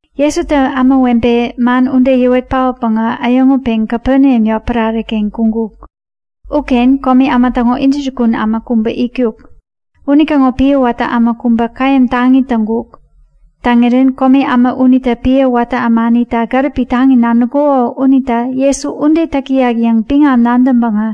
Jesutä ämawebe man ude yäwet paotpäŋä äyäŋutpeŋ Kapeneam yotpärare-ken kuŋkuk. Uken komi äma täŋo intäjukun äma kubä itkuk. Unitäŋo piä watä äma kubä käyäm taŋi täŋkuk. Täŋirän komi äma unitä piä watä ämanita gäripi taŋi nadäŋkuko unita Jesu ude täk täyak yäŋ biŋam nadäŋpäŋä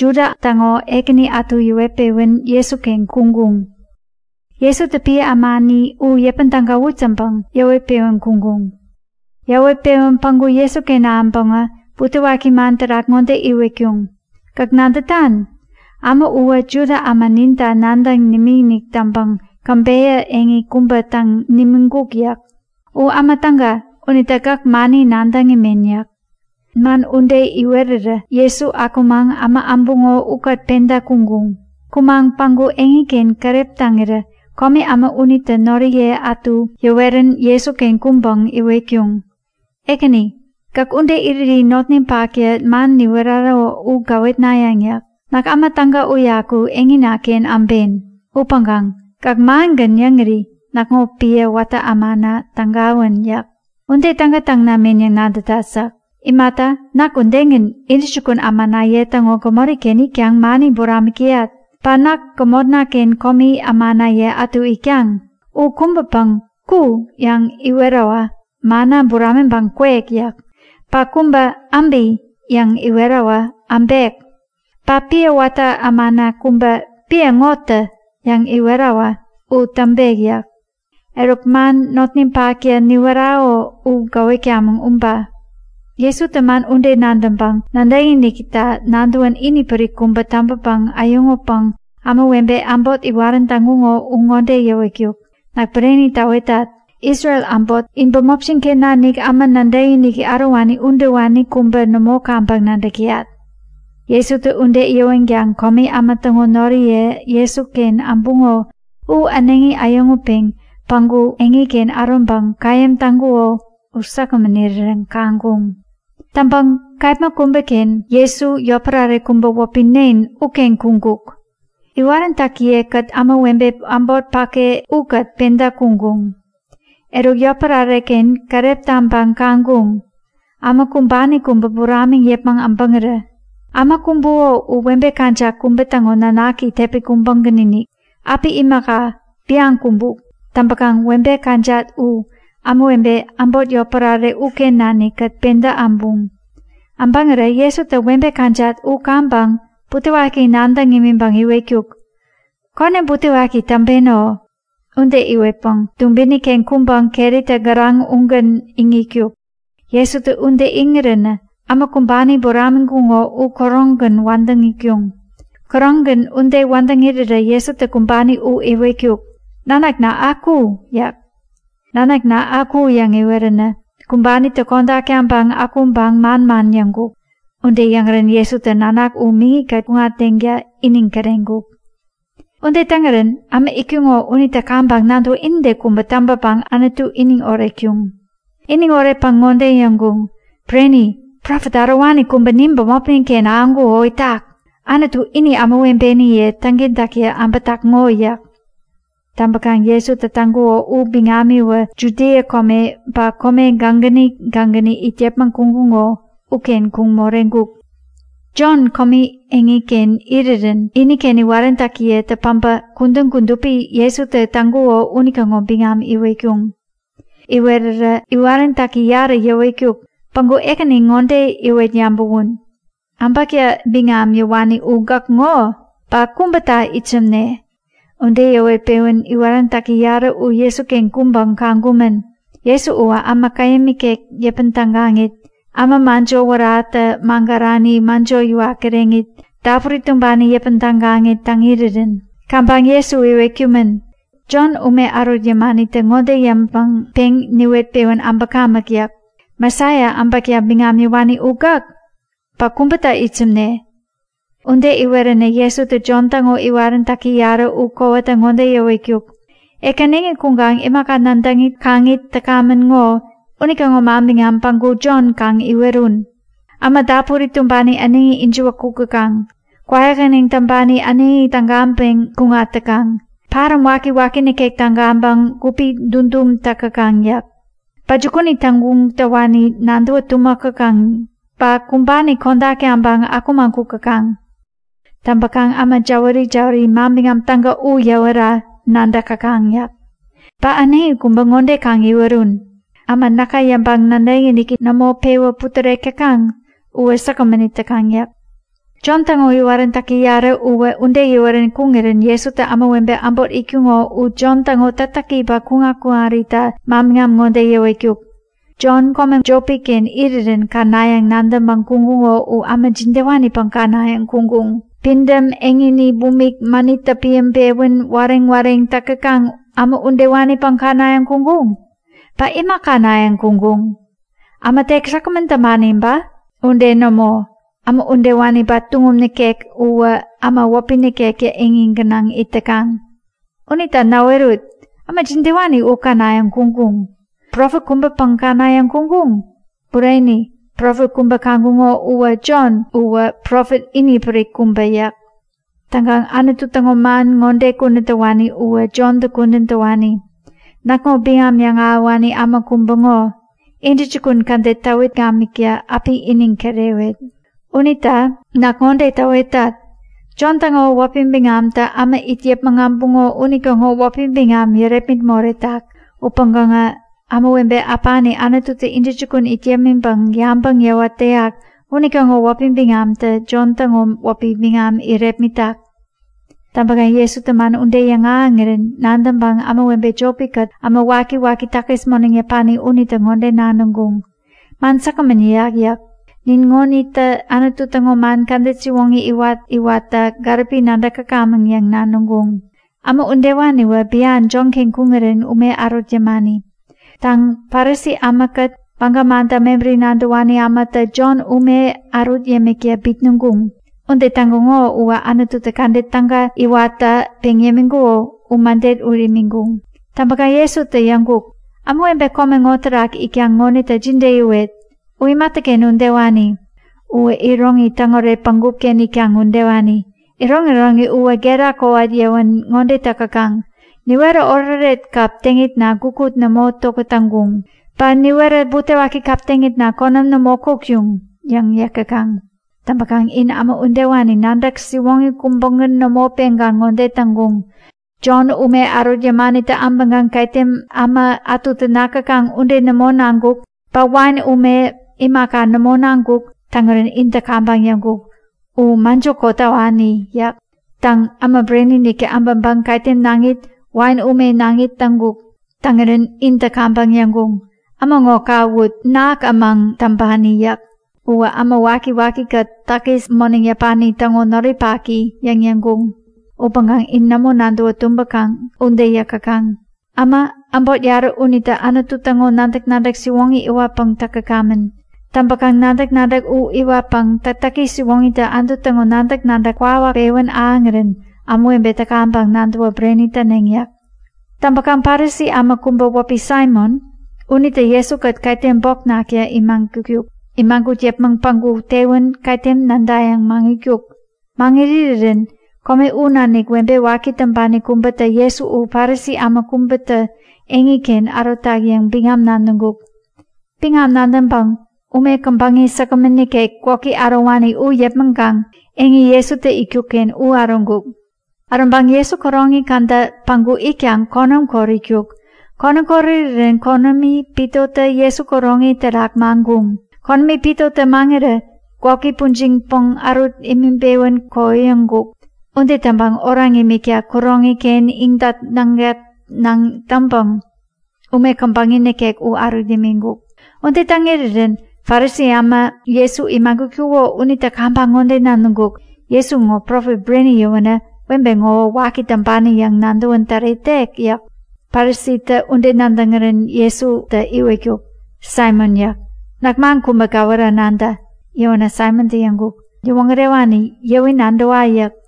Juda täŋo ekäni ätu yäwet-pewän Jesuken kuŋkuŋ. Jesutä piä ämani u yäpän tägawut yäŋpäŋ yäwet-pewän kuŋkuŋ. Yäwet-pewän päŋku Jesuken ahäŋpäŋä butewaki man terak ŋode iwetkuŋ; Gäk nadätan? Äma uwä Juda äma ninta nadäŋ nimikinik täŋpäŋ käbeyä eŋi kubä täŋ nimiŋkuk yäk. U äma täga unita gäk mani nadäŋ imen yäk. Man ude iwerirä Jesu akumaŋ äma äbuŋo ukät penta kuŋkuŋ. Kumaŋ päŋku eŋiken keräp taŋirä komi äma unitä noriye ätu yäwerän Jesuken kuŋpäŋ iwetkuŋ; Ekäni, gäk ude iriri notninpaktä man niwerako u gäwetnayäŋ yäk. Näk äma täga uyaku eŋina-ken äben. Upäŋkaŋ gäk mangän yäŋiri näkŋo piä watä ämana tägawän yäk. Ude täga täŋ namen yäŋ nadätat yäk. Imata, näk udegän, intäjukun ämanaye täŋo gämori-ken itkaŋ mani buramik täyat. Ba näk gämotna-ken komi ämanaye ätu itkaŋ. U kubäpäŋ, Ku! yäŋ iwerawä, manna buramiŋpäŋ kwek yäk. Ba kubä, Äbi! yäŋ iwerawä, äbek. Ba piä watä ämana kubä, Piä ŋo tä! yäŋ iwerawä u täŋpek yäk. Eruk, man notninpaktä niwerako u gäwetkamäŋ uba. Jesutä man ude nadäŋpäŋ nadäkinikita nadäwän inipärik kubä täŋpäpäŋ äyäŋutpäŋ ämawebe äbot iwarän täŋkuŋo u ŋode yäwetkuk; Näk bureni täwetat. Isrel äbot in bämopjin-ken nanik äma nadäkiniki ärowani udewani kubä nämo kaŋpäŋ nadäk täyat! Jesutä ude yäwänkaŋ komi äma täŋo noriye Jesuken äbuŋo u äneŋi äyäŋutpeŋ päŋku eŋiken äroŋpäŋ käyäm täŋkuko u säkgämän irirän kaŋkuŋ. Täŋpäŋ kepma kubäken Jesu yotpärare kubä wäpi Nen uken kuŋkuk. Iwaräntäkiye-kät ämawebe äbot päke ukät penta kuŋkuŋ. Eruk, yotpärare-ken keräp taŋpäŋ kaŋkuŋ, äma kumbani kubä buramiŋ yäpmäŋ äbäŋirä. Äma kumbuko u webe kajat kubä täŋo nanaki tepi kubägän-inik. Äpi imaka, bian kumbuk. Täŋpäkaŋ webe kajat u ämawebe äbot yotpärare uken nanikkät penta äbuŋ. Äbäŋirä Jesutä webe kajat u kaŋpäŋ butewaki nadäŋ imiŋpäŋ iwetkuk; Konäm butewaki täŋpeno! Ude iwetpäŋ dubini-ken kuŋpäŋ keritä gäraŋ ugän iŋitkuk. Jesutä ude iŋiränä äma kumbani buramiŋkuŋo u käroŋgän wädäŋ itkuŋ. Käroŋgän ude wädäŋ irirä Jesutä kumbani u iwetkuk; Nanakna, aku! yäk. Nanakna, Aku yäŋ iweränä kumbanitä kodak taŋpäŋ akuŋpäŋ manman yäŋkuk. Ude yäŋirän Jesutä nanak u miŋi-kät kuŋatdeŋta iniŋ kireŋkuk. Ude täŋirän äma itkuŋo unitä kaŋpäŋ nadäwä inide kubä täŋpäpäŋ Anutu iniŋ oretkuŋ. Iniŋ oretpäŋ ŋode yäŋkuŋ; Bureni! Profet ärowani kubä nin bämopnin-ken ahäŋkuko itak! Anutu ini ämawebeniye täŋkentäkta äbätak ŋo! yäk. Täŋpäkaŋ Jesutä täŋkuko u biŋamiwä Judia kome ba kome gägäni gägäni it yäpmäŋ kuŋkuŋo uken kuŋ moreŋkuk. Jon komi eŋiken irirän iniken iwaräntäkiyetä päbä kudän kudupi Jesutä täk täŋkuko unitäŋo biŋam iwetkuŋ. Iwerirä iwaräntäki yarä yäwetkuk; Päŋku Ekäni ŋode iwet yabäwun; Äbäkta biŋam yäwani u gäk ŋo? Ba kubäta itsämne? Ude yäwet-pewän iwaräntäki yarä u Jesuken kuŋpäŋ kaŋkumän; Jesu uwä äma käyäm ikek yäpän tägaŋit, äma mäjo wäratä magärani mäjo yäwat kireŋit, dapuri tumbani yäpän tägaŋit täŋ irirän. Kaŋpäŋ Jesu iwetkumän; Jon ume ärut yämanitä ŋode yäŋpäŋ peŋ niwet-pewän äbäkamäk yäk. Mesaia, äbäkta biŋam yäwani u gäk? Ba kubäta itsämne? Ude iweränä Jesutä Jon täŋo iwaräntäki yarä u kowata ŋode yäwetkuk; Ek äneŋi kuŋkaŋ imaka nadäŋit kaŋit täkamän ŋo, unitäŋo manbiŋam päŋku Jon kaŋ iwerun. Äma dapuri tumbani äneŋi ijiwä kuk täkaŋ. Kwäyähäneŋ täŋpani äneŋi tägaŋpeŋ kuŋat täkaŋ. Paräm wakiwaki nikek tägaŋpäŋ gupi dudum tak täkaŋ yäk. Ba jukuni täŋguŋ täwani nadäwä tumäk täkaŋ, ba kumbani kodak taŋpäŋ akumaŋ kuk täkaŋ. Täŋpäkaŋ äma jäwäri-jäwäri Manbiŋam Täga u yäwera nadäk täkaŋ yäk. Ba äneŋi kubä ŋode kaŋ iwerun; Äma näka yäŋpäŋ nadäkiniki nämo pewä putärek täkaŋ uwä säkgämän it täkaŋ yäk. Jon täŋo iwaräntäki yarä uwä ude yäwerän kuŋirän Jesutä ämawebe äbot itkuŋo u Jon täŋo täktäki ba kuŋat-kuŋarita manbiŋam ŋode yäwetkuk; Jon kome jopi-ken irirän känayäŋ nadäŋpäŋ kuŋkuŋo u äma jidewanipäŋ känayäŋ kuŋkuŋ? Pidäm eŋini bumik, mänittä piäŋpewän wareŋ-wareŋ täk täkaŋ äma udewanipäŋ känayäŋ kuŋkuŋ? Ba ima känayäŋ kuŋkuŋ? Äma tek säkgämän täŋpani ba? Ude nämo! Äma udewani ba tuŋum nikek uwä äma wäpi nikektä eŋi gänaŋ it täkaŋ. Unita näwerut! Äma jidewani u känayäŋ kuŋkuŋ? Profet kubäpäŋ känayäŋ kuŋkuŋ? Bureni, profet kubä kaŋkuŋo upäŋ Jon uwä profet inipärik kubä yäk. Täŋkaŋ Anutu täŋo man ŋode kudän täwani uwä Jonta kudän täwani; Näkŋo biŋam yäŋahäwani äma kubä ŋo. Intäjukun kädet täwit gamikta api iniŋ kirewet. Unita näk ŋode täwetat; Jon täŋo wäpi biŋamtä äma it yäpmäŋ äbuŋo unitäŋo wäpi biŋam yärepmit moretak. Upäŋkaŋä ämawebe äpani Anututä intäjukun it yämiŋpäŋ yabäŋ yäwat täyak unitäŋo wäpi biŋamtä Jon täŋo wäpi biŋam irepmitak. Täŋpäkaŋ Jesutä man ude yäŋahäŋirän nadäŋpäŋ ämawebe jopi-kät äma wakiwaki takis moneŋ yäpani unitä ŋode nadäŋkuŋ; Man säkgämän yäyak yäk. Nin ŋo ŋonitä Anutu täŋo man kädet siwoŋi iwat-iwatta gäripi nadäk täkamäŋ yäŋ nadäŋkuŋ. Äma udewaniwä bian Jonken kuŋirä ume ärut yämani. Täŋ, Parisi ämakät Baga manta mebäri nadäwani ämatä Jontä ume ärut yämikta bitnäŋkuŋ. Ude täŋkuŋo uwä Anututä kädet täga iwatta peŋ yämiŋkuko u mäde ut imiŋkuŋ. Täŋpäkaŋ Jesutä yäŋkuk; Ämawebe kome ŋo terak itkaŋ ŋonita jide yäwet? U imatäken udewani? Uwä iroŋi täŋoret bägup-ken itkaŋ udewani. Iroŋiroŋi uwä gera kowat yäwän ŋode täk täkaŋ; Niwerä oretoret kap teŋitna gukut nämo tokät täŋkuŋ. Ba niwerä butewaki kap teŋitna, konäm nämo kotkuŋ yäŋ yäk täkaŋ. Täŋpäkaŋ in uwä udewani, nadäk siwoŋi kubägän nämo peŋkaŋ ŋode täŋkuŋ; Jon ume ärut yämanitä äbäŋkaŋ ketem äma ätutä nak täkaŋ ude nämo naŋkuk ba wain ume imaka nämo naŋkuk. Täŋirän intä kaŋpäŋ yäŋkuŋ; U mäjotä kotawani! yäk. Täŋ, Äma Bureni-iniktä äbäŋpäŋ ketem naŋit wain ume naŋit täŋkuk. Täŋirän intä kaŋpäŋ yäŋkuŋ; Äma ŋo kawut! Nak ämäŋ täŋpani! yäk. Uwä äma waki-waki-kät takis moneŋ yäpani täŋo noripaki! yäŋ yäŋkuŋ. Upäŋkaŋ in nämo nadäwä tumbäkaŋ ude yäk täkaŋ. Äma äbot yarä unitä Anutu täŋo nadäk-nadäk siwoŋi iwatpäŋ täk täkamän. Täŋpäkaŋ nadäk-nadäk u iwatpäŋ täktäki siwoŋitä Anutu täŋo nadäk-nadäk kwawak pewän ahäŋirän ämawebetä kaŋpäŋ nadäwä bureni täneŋ yäk. Täŋpäkaŋ Parisi äma kubä wäpi Saimon unitä Jesu-kät ketem bok nakta imagutkuk. Imagut yäpmäŋ päŋku tewän ketem nädayäŋ maŋitkuk. Maŋit irirän kome u nanik webe waki täŋpani kubätä Jesu u Parisi äma kubätä eŋiken ärotak yäŋ biŋam nadäŋkuk. Biŋam nadäŋpäŋ ume käbäŋi säkgämän nikek gwäki ärowani u yäpmäŋkaŋ eŋi Jesutä itkuk-ken u äroŋkuk. Äroŋpäŋ Jesu kuroŋi käda päŋku itkaŋ konäm kot itkuk. Konäm kot irirän konämi pitotä Jesu kuroŋi terak maŋkuŋ. Konämi pitotä maŋirä gwäki pujiŋpäŋ ärut imiŋpewän kohoyäŋkuk. Ude täŋpäŋ oraŋ imikta kuroŋi-ken iŋdat-naŋdat-naŋ täŋpäŋ ume käbäŋi nikek u ärut imiŋkuk. Ude täŋ irirän Parisi äma Jesu imagutkuko unitä kaŋpäŋ ŋode nadäŋkuk; Jesu ŋo profet bureni yäwänä webe ŋowä waki täŋpani yäŋ nadäwän täretek yäk. Parisitä ude nadäŋirän Jesutä iwetkuk; Saimon yäk. Näk man kubä gäwera nadä. Yäwänä Saimontä yäŋkuk; Yäwoŋärewani, yäwi nadäwa yäk.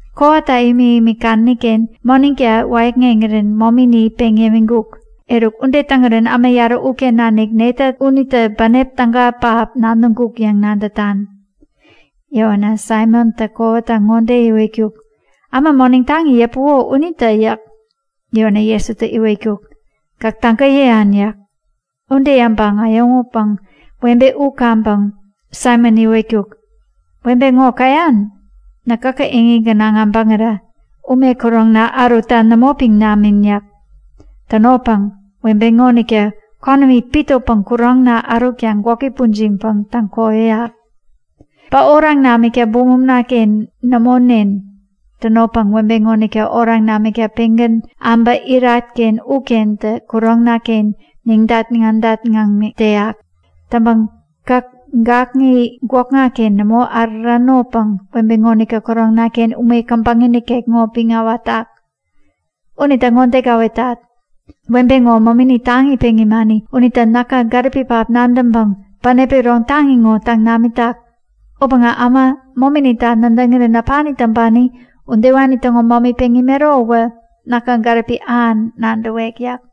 Kowata imik-imik kadäni-ken moneŋta wäyäkŋeŋirän momini peŋ yämiŋkuk. Eruk, ude täŋirän äma yarä uken nanik netä unitä bänep täga pähap nadäŋkuk yäŋ nadätan? Yäwänä Saimontä kowata ŋode iwetkuk; Äma moneŋ taŋi yäpuko unitä yäk. Yäwänä Jesutä ŋode iwetkuk; Gäk täga yäyan yäk. Ude yäŋpäŋ äyäŋutpäŋ webe u kaŋpäŋ Saimon iwetkuk; Webe ŋo käyan? Näk gäkä eŋi gänaŋ äbäŋira ume kuroŋna ärutta nämo piŋ namin yäk. Tänopäŋ webe ŋonitä konämi pitopäŋ kuroŋna ärutkaŋ gwäki pujiŋpäŋ täŋkohoyäk. Ba oraŋ namikta bumumnaken nämo nen. Tänopäŋ webe ŋonitä oraŋ namikta pengän äba irat-ken ukentä kuroŋna-ken neŋdat-naŋdat-naŋ täyak. Täŋpäŋ gäk gakŋi gwäkna-ken nämo äruranopäŋ webe ŋonitä kuroŋna-ken ume käbäŋi nikek ŋo piŋ äwatak. Unita ŋode gäwetat. Webe ŋo momini taŋi peŋ imani unita näka gäripi pähap nadäŋpäŋ bänep iron taŋi ŋo täŋ namitak. Upäŋkaŋ äma mominita nadäŋirän äpani täŋpani udewani täŋo momi peŋ imero uwä näka gäripi ähan nadäwek yäk.